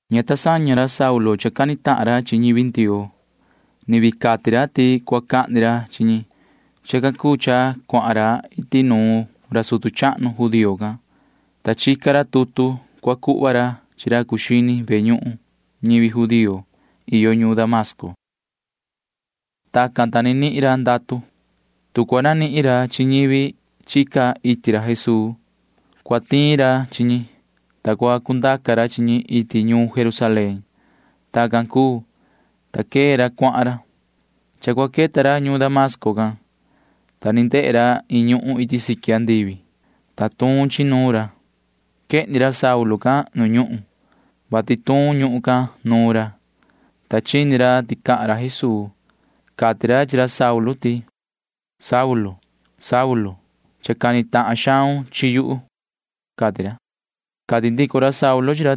Ña ta saña ra Saulu cha cani tahan ra chi ñivi Ndioo. Ni vii cati ra ti cua cahni ra chi ñi. Chacan cuu cha cuahan ra iti nuun ra sutu chahnu judío can, ta chica ra tutu cua cuhva ra chi ra cuu xini ve ñuhun ñivi judío iyo ñuun Damasco. Tacan, ta ni nihin ra ndatu. Tu cua nanihin ra chi ñivi chica iti Jesuu, cua tiin ra chi ñi, ta cua cundaca ra chi ñi iti ñuun Jerusalén. Tacan cuu, ta quee ra cuahan ra. Cha cua queta ra ñuun Damasco can, ta ni ndehe ra iin ñuhun iti siqui andivi, ta tuun chi nuun ra. Quehni ra Saulu can nu ñuhun, vati tuun ñuhun can nuun ra, ta chini ra ti cahan ra Jesuu. Cati ra chi ra Saulu ti: ―Yoho Saulu, cha cani tahan xaun chi yuhu ―cati ra. Cati ndico ra Saulu chi ra: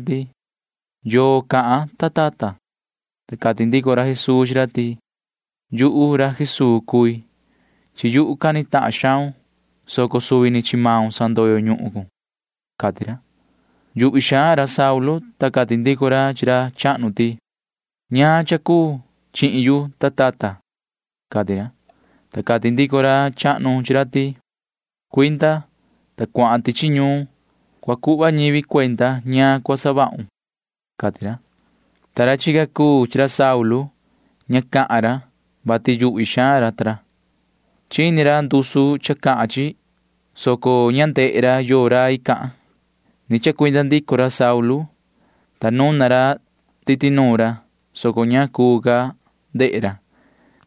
―¿Yoo cahan, ta tata? Ta cati ndico ra Jesuu chi ra ti: ―Yuhu ra Jesuu cui. Chi yuhu cani tahan xaun, soco suvi ni chi maun sandoyo ñuhun cun ―cati ra. Yuhvi xaan ra Saulu, ta cati ndico ra chi ra chahnu ti: ―¿Ñaan cha cuun chihin yu, ta tata? ―cati ra. Ta cati ndico ra chahnu chi ra ti: ―Cuinda, ta cuahan tichi ñuun. Cua cuhva ñivi cuenda ñaan cha cua savahun ―cati ra. Ta ra chica chi ra Saulu―ña cahan ra, vati yuhvi xaan ra. Chini ra ndusu cha cahan chi, soco ña ndehe ra yoo rai cahan. Ni chacuinda ndico ra Saulu, ta nuna ra titi nuun ra, soco ña cuu ca ndehe ra.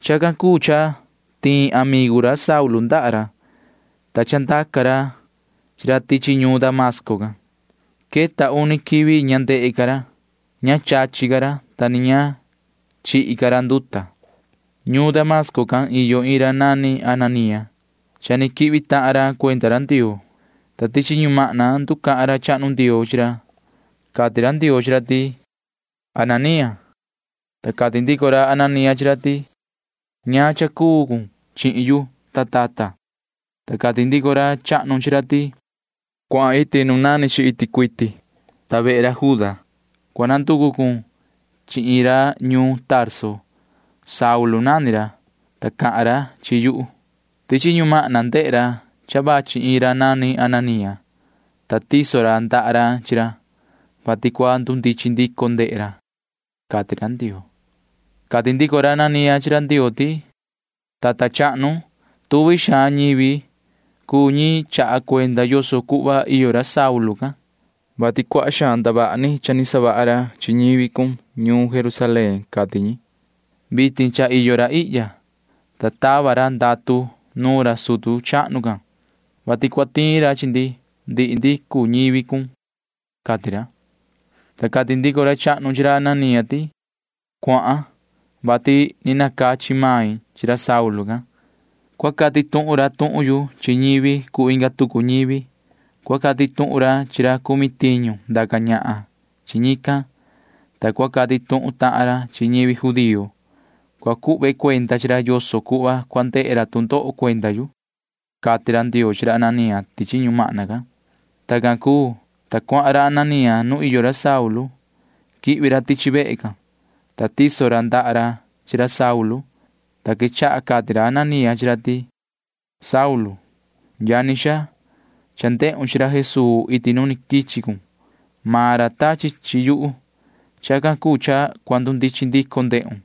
Chacan cuu cha tiin ra amigu ra Saulu ndaha ra, ta chandaca ra chi ra tichi ñuun Damasco can. Queta uni quivi ña ndehe ca ra. Ña chachi ca ra, ta ni ña chihi ca ra nduta. Ñuun Damasco can cha iyo iin ra nani Ananía. Cha ni quihvi tahan ra cuenda ra Ndioo, ta tichi ñumahna nducahan ra chahnu Ndioo chi ra. Cati ra Ndioo chi ra ti: ―Yoho Ananía. Ta cati ndico ra Ananía chi ra ti: ―¿Ñaan cha cuu cha cuun chihin yu, ta tata? Ta cati ndico ra chahnu chi ra ti: ―Cuahan maun iti nu nani chi iti cuiti, ta vehe ra Juda cua nanducu cun chi iin ra ñuun Tarso. Saulu nani ra, ta cahan ra chi yuhu. Tichi ñumahna ndehe ra cha vachi iin ra nani Ananía, ta tiso ra ndaha ra chi ra, vati cua ndundichin ndico ndehe ra ―cati ra Ndioo. Cati ndico ra Ananía chi ra Ndioo ti: ―Tata chahnu, tuvi xaan ñivi cuu ñi chaha cuenda yoso cuhva iyo ra Saulu can, vati cuaha xaan ndavaha ni cha ni savaha ra chi ñivi cun ñuun Jerusalén, cati ñi. Vitin cha iyo ra ihya, ta tava ra ndatu nuun ra sutu chahnu can, vati cua tiin ra chi ndihi ndi cuu ñivi cun ―cati ra. Ta cati ndico ra chahnu chi ra Ananía ti: ―Cuahan, vati ni nacachi main chi ra Saulu can. Cua cati tuhun ra tuhun yu chi ñivi cuu inga tucu ñivi. Cua cati tuhun ra chi ra cumi tiñu ndaca ñahan chi ñican, ta cua cati tuhun tahan ra chi ñivi judío. Cua cuhve cuenda chi ra yoso cuhva cua ndehe ra tu ndoho cuenda yu ―cati ra Ndioo chi ra Ananía tichi ñumahna can. Tacan cuu, ta cuahan ra Ananía nu iyo ra Saulu. Quihvi ra tichi vehe can, ta tiso ra ndaha ra chi ra Saulu, ta quechaha cati ra Ananía chi ra ti: ―Yoho Saulu, yani xaa, cha ndehun chi ra Jesuu iti nu ni quichi cun. Maan ra tachi chi yuhu. Chacan cuu cha cua ndundichin ndico ndehun,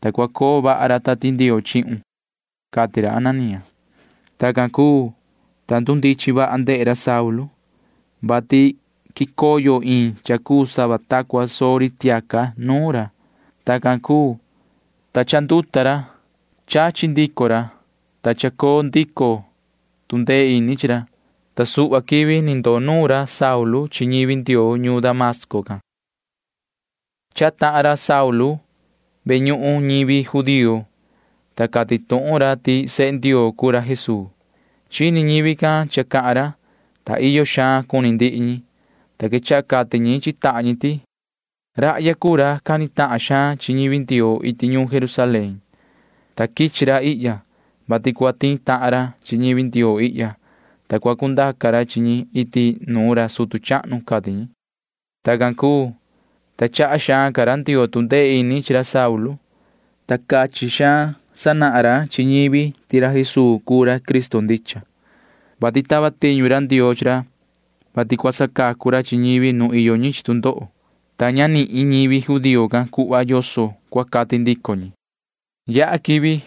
ta cua coo vaha ra Tati Ndioo chihun ―cati ra Ananía. Tacan cuu, ta ndundichin vaha ndehe ra Saulu, vati quicoyo iin cha cuu sava ta cua soo ri tiaca nuun ra. Tacan cuu, ta cha chanduta ra. Chachi ndico ra, ta cha coo ndico tu ndee ini chi ra, ta suhva quivi ni ndoo nuun ra Saulu chi ñivi Ndioo ñuun Damasco can. Chahan tahan ra Saulu ve ñuhun ñivi judío, ta cati tuhun ra ti sehe Ndioo cuu ra Jesuu. Chini ñivi can cha cahan ra, ta iyo xaan cuni ndihi ñi, ta quechaha cati ñi chi tahan ñi ti: ―Rahya cuu ra cani tahan xaan chi ñivi Ndioo iti ñuun Jerusalén, ta quichi ra ihya, vati cua tiin tahan ra chi ñivi Ndioo ihya, ta cua cundaca ra chi ñi iti nuun ra sutu chahnu ―cati ñi. Tacan cuu, ta chaha xaan ca ra Ndioo tu ndee ini ra chi ra Saulu, ta cachin xaan sanahan ra chi ñivi ti ra Jesuu cuu ra Cristo ndicha, [vati tava tiñu ra Ndioo chi ra, vati cua sacacu ra chi ñivi nu iyo ñi chi tu ndoho,] ta ña nihin ñivi judío can cuhva yoso cua cati ndico ñi. Yaha quivi,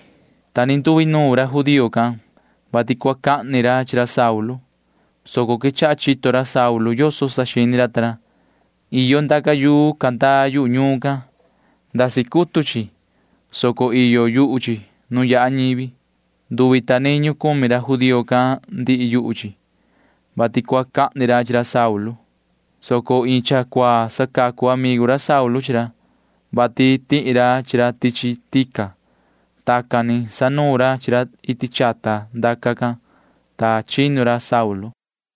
ta ni nduinuun ra judío can, vati cua cahni ra chi ra Saulu, soco quechaha chito ra Saulu yoso saxini ra ta ra. Iyo ndaca yuu candaa yu ñuun can. Ndasi cutu chi, soco iyo yuhu chi nu yaha ñivi. Nduvi ta niñu cumi ra judío can ndihi yuhu chi, vati cua cahni ra chi ra Saulu, soco iin cha cuaa sacacu amigu ra Saulu chi ra, vati tihi ra chi ra tichi tica. Tacan ni sanuun ra chi ra iti chata ndaca can, ta chinu ra Saulu.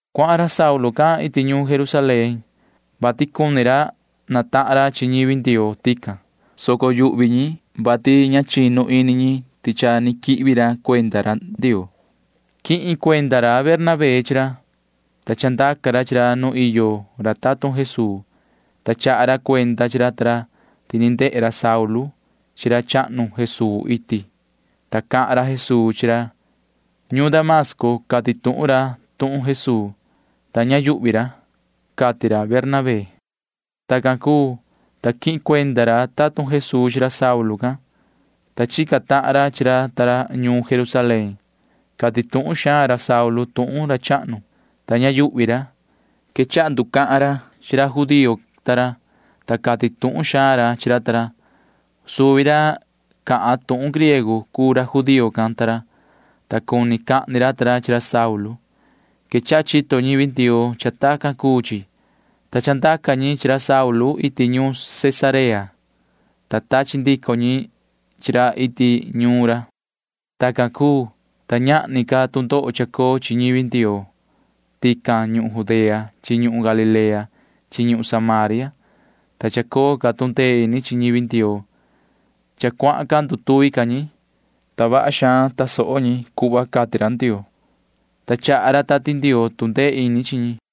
Cuahan ra Saulu can iti ñuun Jerusalén, vati cuni natahan ra chi ñivi Ndioo tican, soco yuhvi ñi, vati ña chinu ini ñi ti cha ni quihvi ra cuenda Ndioo. Quihin cuenda ra Bernabé chi ra, ta chandaca ra chi ra nu iyo ra tatun Jesuu, ta chaha ra cuenda chi ra ta ra ti ni ndehe ra Saulu chi ra chahnu Jesuu iti, ta cahan ra Jesuu chi ra. Ñuun Damasco cati tuhun ra tuhun Jesuu, ta ña yuhvi ra, cati ra Bernabé. Tacan cuu, ta quihin cuenda ra tatun Jesuu chi ra Saulu can, ta chica tahan ra chi ra ta ra ñuun Jerusalén. Cati tuhun xaan ra Saulu tuhun ra chahnu, ta ña yuhvi ra. Quechaha nducahan ra chi ra judío ta ra, ta cati tuhun xaan ra chi ra ta ra. Suvi ra cahan tuhun griego cuu ra judío can ta ra, ta cuni cahni ra ta ra chi ra Saulu. Quechaha chito ñivi Ndioo cha tacan cuu chi, ta chandaca ñi chi ra Saulu iti ñuun Cesarea, ta tachi ndico ñi chi ra iti ñuun ra. Tacan cuu, ta ñahni ca tu ndoho chacoo chi ñivi Ndioo tican ñuhun Judea chi ñuhun Galilea chi ñuhun Samaria, ta chacoo ca tu ndee ini chi ñivi Ndioo. Cha cuahan ndutuvi ca ñi, ta vaha xaan tasoho ñi cuhva cati ra Ndioo, ta chaha ra Tati Ndioo tu ndee ini chi ñi.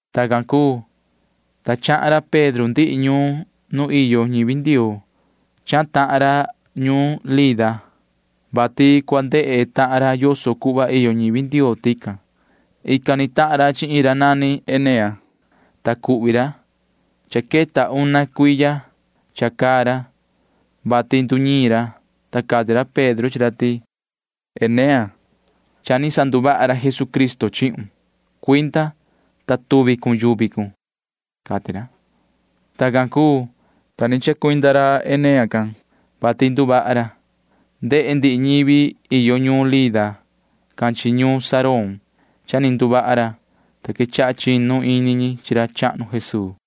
Tacan cuu, ta chahan ra Pedro ndihi ñuun nu iyo ñivi Ndioo. Chahan tahan ra ñuun Lida, vati cua ndehe tahan ra yoso cuhva iyo ñivi Ndioo tican. Ican ni tahan ra chi iin ra nani Enea, ta cuhvi ra. Cha queta una cuiya cha caa ra, vati nduñiin ra, ta cati ra Pedro chi ra ti: ―Yoho Enea, cha ni sanduvaha ra Jesucristo chihun. Cuinda, ta tuvi cun yuvi cun ―cati ra. Tacan cuu, ta ni chacuinda ra Enea can, vati nduvaha ra. Ndehe ndihi ñivi iyo ñuun Lida can chi ñuun Sarón cha ni nduvaha ra, ta quechaha chinu ini ñi chi ra chahnu Jesuu.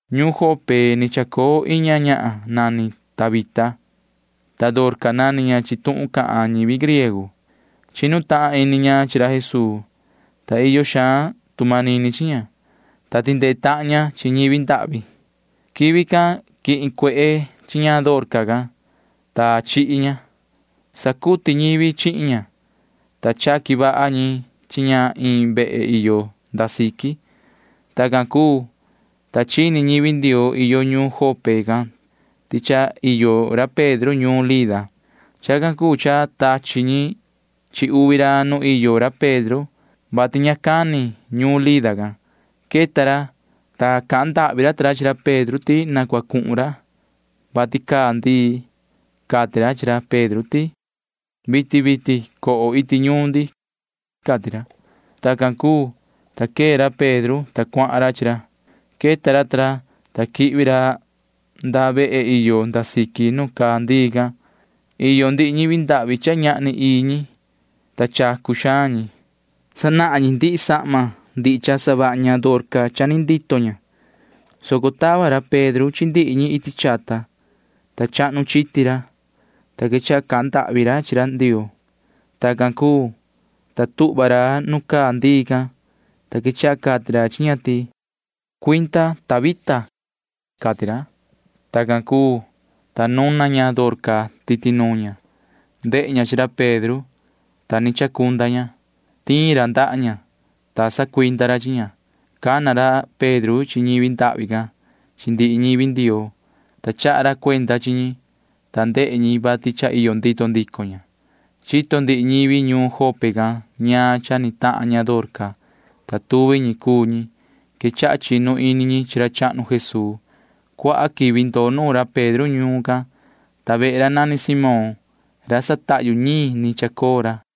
Ñuun Jope ni chacoo iin ñahan nani Tabita, ta Dorca nani ña chi tuhun cahan ñivi griego. Chinu tahan ini ña chi ra Jesuu, ta iyo xaan tu manini chi ña, ta tindee tahan ña chi ñivi ndahvi. Quivi can quihin cuehe chi ña Dorca can, ta chihi ña. Sacuti ñivi chihin ña, ta chaqui vaha ñi chi ña iin vehe iyo nda siqui. Tacan cuu, ta chini ñivi Ndioo iyo ñuun Jope can ti cha iyo ra Pedro ñuun Lida. Chacan cuu cha tachi ñi chi uvi ra nu iyo ra Pedro, vati ña cani ñuun Lida can. Queta ra, ta cahan ndahvi ra ta ra chi ra Pedro ti na cua cuhun ra, vati caa ndii. Cati ra chi ra Pedro ti: ―Vitin vitin coho iti ñuun ndi ―cati ra. Tacan cuu, ta quee ra Pedro, ta cuahan ra chi ra. Queta ra ta ra, ta quihvi ra nda vehe iyo nda siqui nu caa ndii can. Iyo ndihi ñi ndahvi cha ñahni ii ñi, ta chacu xaan ñi. Sanahan ñi ndihi sahma ndihi cha savaha ña Dorca cha ni ndito ña, soco tava ra Pedro chi ndihi ñi iti chata, ta chahnu chiti ra, ta quechaha cahan ndahvi ra chi Ndioo. Tacan cuu, ta tuhva ra nu caa ndii can, ta quechaha cati ra chi ña ti: ―Cuinda, Tabita ―cati ra. Tacan cuu, ta nuna ña Dorca titi nuun ña. Ndehe ña chi ra Pedro, ta ni chacunda ña. Tiin ra ndaha ña, ta sacuinda ra chi ña. Cana ra Pedro chi ñi ndahvi can chi ndihi ñivi Ndioo, ta chaha ra cuenda chi ñi, ta ndehe ñi vati cha iyo ndito ndico ña. Chito ndihi ñivi ñuun Jope can ñaan cha ni tahan ña Dorca, ta tuvi ñi cuu ñi quechaha chinu ini chi ra chahnu Jesuu. Cuaha quivi ndoo nuun ra Pedro ñuun can, ta vehe ra nani Simón ra satahyu ñiin ni chacoo ra.